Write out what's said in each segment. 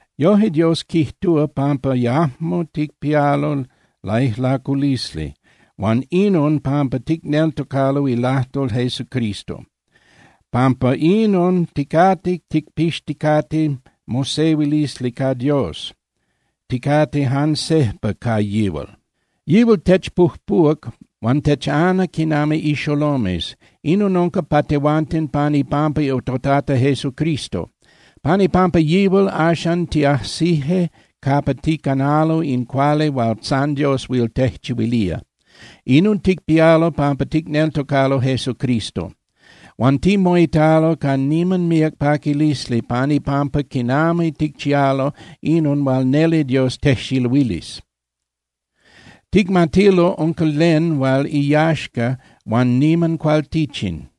Yoje, Dios quijtúa pampa yajmo ticpialo laijlaculisli huan inon pampa ticneltocalo ilajtol Jesucristo. Pampa inon ticate ticpixticate mosehuilisli ca Dios, ticate jan sejpa ca yihual. Yihual techpujpuhuac huan techana quinami ixolomes. Inon unca pa tehuanten pan ipampa toTata Jesucristo. Pan ipampa yihual, axan tiajsije capa ticanalo in cuali hual san Dios huil tejchihuilía. Inon ticpialo pampa ticneltocalo Jesucristo. Huan timoitalo ca niman míac paquilisli pan ipampa quinami ticchialo inon hual neli Dios tejxiluilis. Ticmatilo unca len hual iyaxca huan niman cualtichin.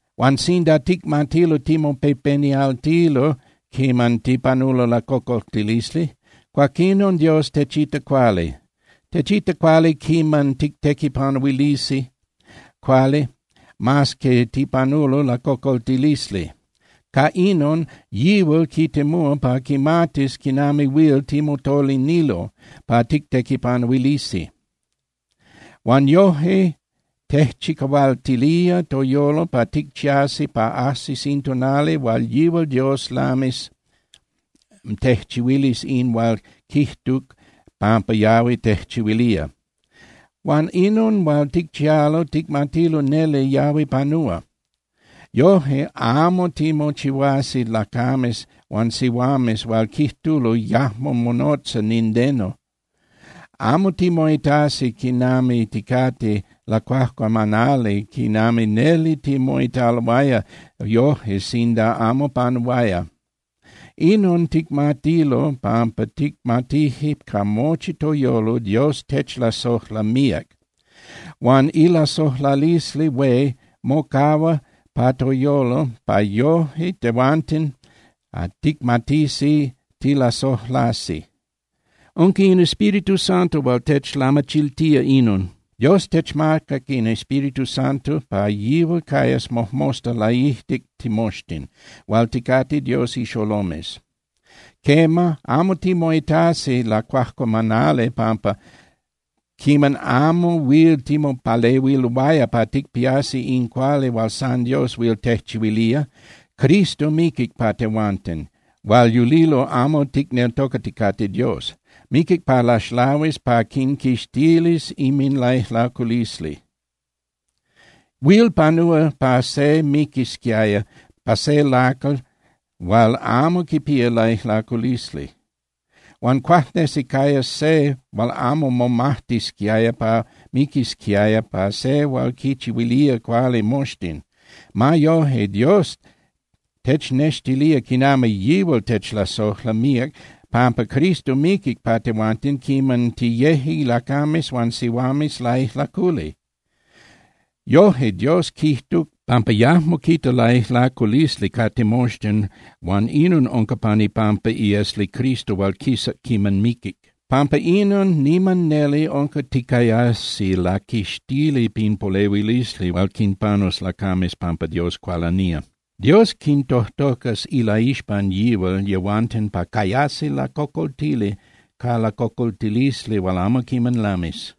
Huan sinda ticmatilo timopepenialtilo quiman tipanulo lacocoltilisli, cuaquinon Dios techita cuali. Techita cuali quiman tictequipanuilisi cuali mas que tipanulo lacocoltilisli. Ca inon yihual quitemúa pa quimatis quinami huil timotolinilo pa tictequipanuilisi. Huan yoje tejchicahualtilía toyolo pa ticchiasi pa ajsis in tonali hual yihual Dios lamis tejchihuilis in hual quijtuc pampa yahui tejchihuilía. Huan inon hual ticchialo ticmatilo neli yahui panúa. Yoje amo timochihuasi lacames huan sihuames hual quijtulo yajmo monotza nindeno. Amo timoitasi quinami ticate lacuajcuamanali quinami neli timoitaloaya yoje sinda amo panuaya. Inon ticmatilo pampa ticmatije ca mochi toyolo Dios techlasojla míac. Huan ilasojlalisli hué mocahua pa toyolo pa yoje tehuanten ticmatisi tilalasojlasi. Unca in Espíritu Santo hual techlamachiltía inon. Dios techmacac in Espíritu Santo pa yihual cayas mojmosta laijtic timoxtin hual ticate Dios ixolomes. Quema, amo timoitasi lacuajcuamanali pampa quiman amo huil timopalehuiloaya pa ticpiasi in cuali hual san Dios huil tejchihuilía, Cristo miquic pa yehuanten hual yulilo amo quineltocaticate Dios. Miquic pa laxlahuis pa quinquixtilis inminlaijlaculisli. Huil panúa pa se miquisquiaya pa se lacal hual amo quipía laijlaculisli. Huan cuajnesi cayas se hual amo momajtisquiaya pa miquisquiaya pa se hual quinchihuilía cuali moxtin. Ma yoje, Dios technextilía quinami yihual techlasojla míac pampa Cristo miquic pa tehuanten quiman tiyeje lacames huan sihuames laijlaculi. Yoje, Dios quijtuc pampa yajmo quita laijlaculisli ca timoxtin huan inon unca pan ipampa iesli Cristo hual quisac quiman miquic. Pampa inon, niman neli unca ticayasi laquixtili pin polehuilisli hual quinpanus lacames pampa Dios cualanía. Dios quintojtocas ilaixpan yihual yehuanten pa cayasi lacocoltili ca lacocoltilisli hual amo quiman lamis.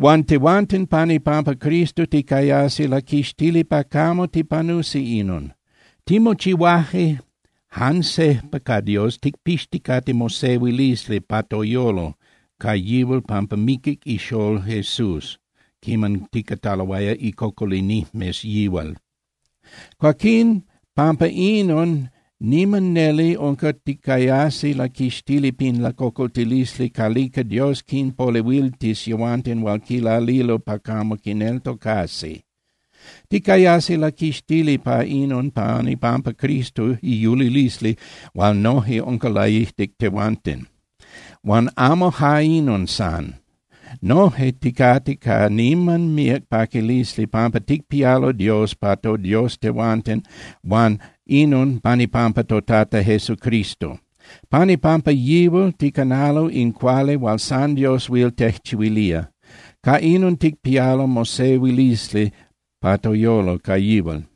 Huan tehuanten, pan ipampa Cristo ticayasi laquixtili pa camo tipanusi inon. Timochihuaje jan sejpa ca Dios ticpixticate mosehuilisli pa toyolo ca yihual pampa miquic iXolol Jesús quiman ticataloaya icocolinijmes yihual. Cuaquín pampa inon niman neli unca ticayasi laquixtili pin lacocoltilisli calica Dios quinpolehuiltis yehuanten hual quilalilo pa camo quineltocasi. Ticayasi laquixtili pa inon pan ipampa Cristo iyulilisli hual noje unca laijtic tehuanten. Huan amo ja inon san. Noje ticate ca niman míac paquilisli pampa ticpialo Dios pa toDios tehuanten huan inon pan ipampa toTata Jesucristo. Pan ipampa yihual ticanalo in cuali hual san Dios huil tejchihuilía. Ca inon ticpialo mosehuilisli pa toyolo ca yihual.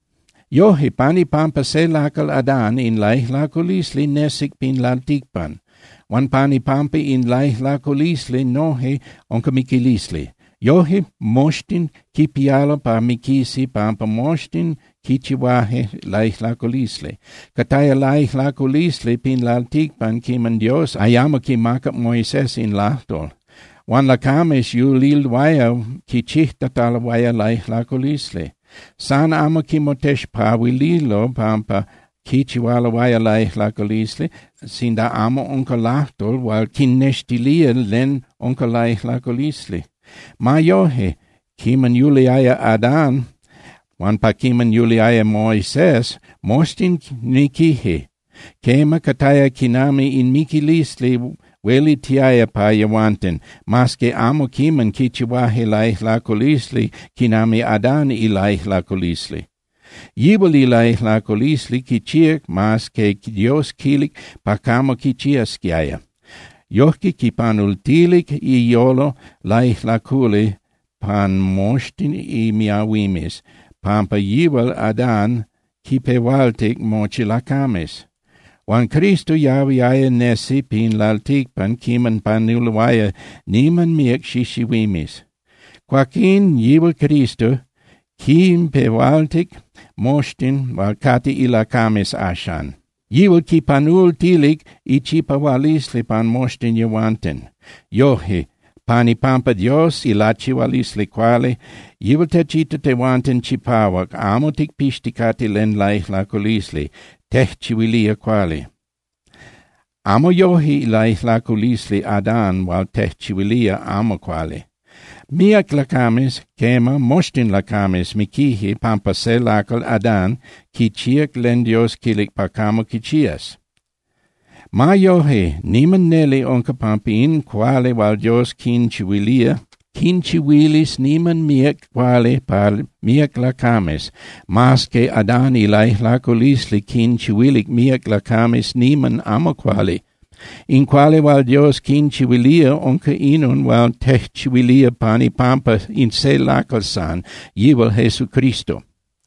Yoje, pan ipampa se lacal Adán in laijlaculisli nesic pin lalticpan. Huan pan ipampa in laijlaculisli noje unca miquilisli. Yoje moxtin quipialo pa miquisi pampa moxtin quichihuaje laijlaculisli. Cataya laijlaculisli pin lalticpan quiman Dios ayamo quimacac Moisés in lajtol. Huan lacames yuliloaya quichijtataloaya laijlaculisli. San amo quinmotexpahuililo pampa quichihualoaya laijlaculisli sinda amo unca lajtol hual quinnextilía len unca laijlaculisli. Ma yoje, quiman yuliaya Adán huan pa quiman yuliaya Moisés, moxtin miquije. Quema, cataya quinami in miquilisli huelitiaya pa yehuanten, mas que amo quiman quichihuaje laijlaculisli quinami Adán ilaijlaculisli. Yihual ilaijlaculisli quichíac mas que Dios quilic pa camo quichiasquiaya. Yojque quipanultilic iyolo laijlaculi pan moxtin imiahuimes, pampa yihual Adán quinpehualtic mochi lacames. Huan Cristo yahuiaya nesi pin lalticpan quiman panuloaya niman míac xixihuimes. Cuaquín, yihual Cristo quinpehualtic moxtin hual cate ilacames axan. Yihual quinpanultilic ichipahualisli pan moxtin yehuanten. Yoje, pan ipampa Dios ilachihualisli cuali, yihual techita tehuanten chipahuac, amo ticpixticate len laijlaculisli, tejchihuilía cuali. Amo yoje ilaijlaculisli Adán hual tejchihuilía amo cuali. Míac lacames, quema, moxtin lacames miquije pampa se lacal, Adán, quichíac len Dios quilic pa camo quichías. Ma yoje, niman neli unca pampa in cuali hual Dios quinchihuilía, quinchihuilis niman míac cuali pa míac lacames, mas que Adán ilaijlaculisli quinchihuilic míac lacames niman amo cuali. In cuali hual Dios quinchihuilía unca inon hual tejchihuilía pan ipampa in se lacal san, yihual Jesucristo.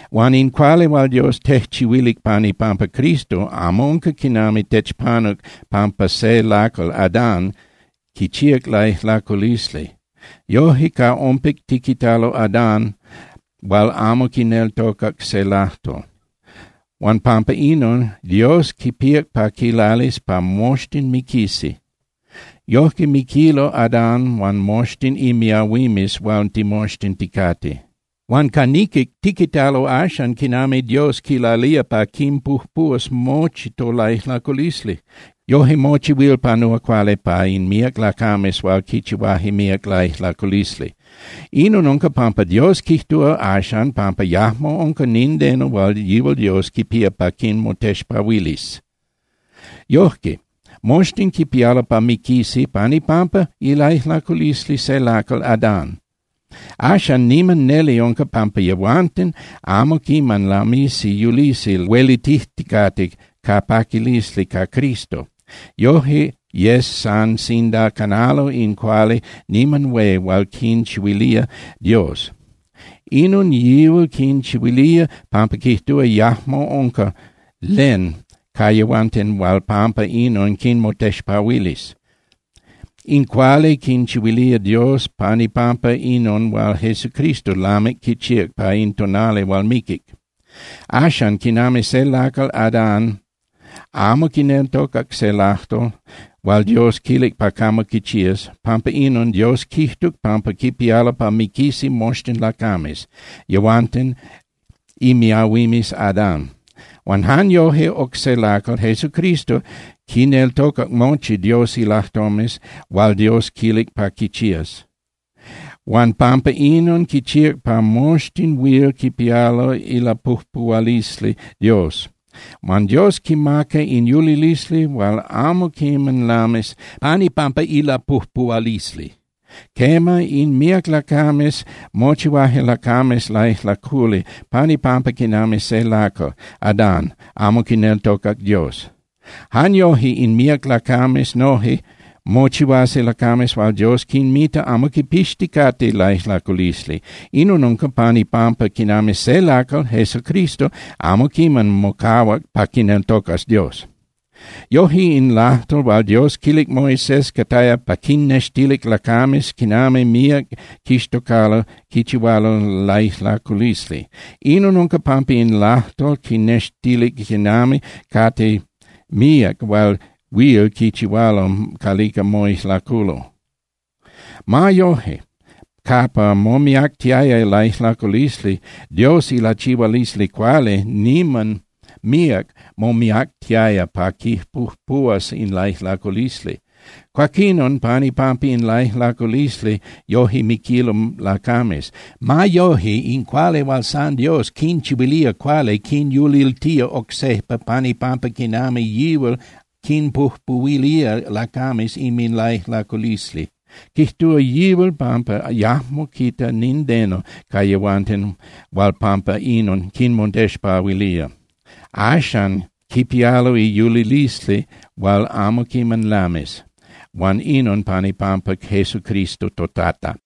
Huan in cuali hual Dios tejchihuilic pan ipampa Cristo amo unca quinami techpanuc pampa se lacal, Adán, quichíac laijlaculisli. Yoje ca ompic tiquitalo Adán hual amo quineltocac se lajtol, huan pampa inon, Dios quipíac pa quilalis pa moxtin miquisi. Yojque miquilo Adán huan moxtin imiahuimes hual timoxtin ticate. Huan ca niquic, tiquitalo axan quinami Dios quilalía pa quinpujpuhuas mochi tolaijlaculisli. Yoje mochi huil panúa cuali pa in míac lacames hual quichihuaje míac laijlaculisli. Inon unca pampa Dios quijtúa axan pampa yajmo unca nindeno hual yihual Dios quipía pa quinmotexpahuilis. Yojque, moxtin quipialo pa miquisi pan ipampa ilaijlaculisli se lacal, Adán. Axan niman neli unca pampa yehuanten amo quiman lamisi yulisi huelitijticate ca paquilisli ca Cristo. Yoje yes san sinda canalo in cuali niman hué hual quinchihuilía Dios. Inon yihual quinchihuilía pampa quijtúa yajmo unca len ca yehuanten hual pampa inon quinmotexpahuilis. In cuali quinchihuilía Dios pan ipampa inon hual Jesucristo lamic quichíac pa in tonali hual miquic. Axan, quinami se lacal, Adán, amo quineltocac se lajtol hual Dios quilic pa camo quichías, pampa inon Dios quijtuc pampa quipialo pa miquisi moxtin lacames, yehuanten imiahuimes Adán. Huan jan yoje oc se lacal, Jesucristo, quineltocac mochi Dios ilajtomes hual Dios quilic pa quichías. Huan pampa inon quichíac pa moxtin huil quipialo ilapujpuhualisli Dios. Huan Dios quinmaca in yulilisli hual amo quiman lamis pan ipampa ilapujpuhualisli. Quema, in míac lacames mochihuaje lacames laijlaculi pan ipampa quinami se lacal, Adán, amo quineltocac Dios. Jan yoje in míac lacames noje mochihuasi lacames hual Dios quinmita amo quipixticate laijlaculisli. Inon unca pan ipampa quinami se lacal, Jesucristo, amo quiman mocahuac pa quineltocas Dios. Yoje in lajtol hual Dios quilic Moisés cataya pa quinnextilic lacames quinami míac quixtocalo quichihualo laijlaculisli. Inon unca pampa in lajtol quinnextilic quinami cate míac hual huil quinchihualo calica moijlaculo. Ma yoje, capa momiactiaya laijlaculisli, Dios ilachihualisli cuali niman míac momiactiaya pa quipujpuhuas in laijlaculisli. Cuaquinon, pan ipampa in laijlaculisli, yoje miquilo lacames. Ma yoje, in cuali hual san Dios quinchihuilía cuali quinyuliltía oc sejpa pan ipampa quinami yihual quinpujpuhuilía lacames inminlaijlaculisli. Quijtúa yihual pampa yajmo quita nindeno ca yehuanten hual pampa inon quinmotexpahuilía. Axan quipialo iyulilisli hual amo quiman lamis, huan inon pan ipampa Jesucristo toTata.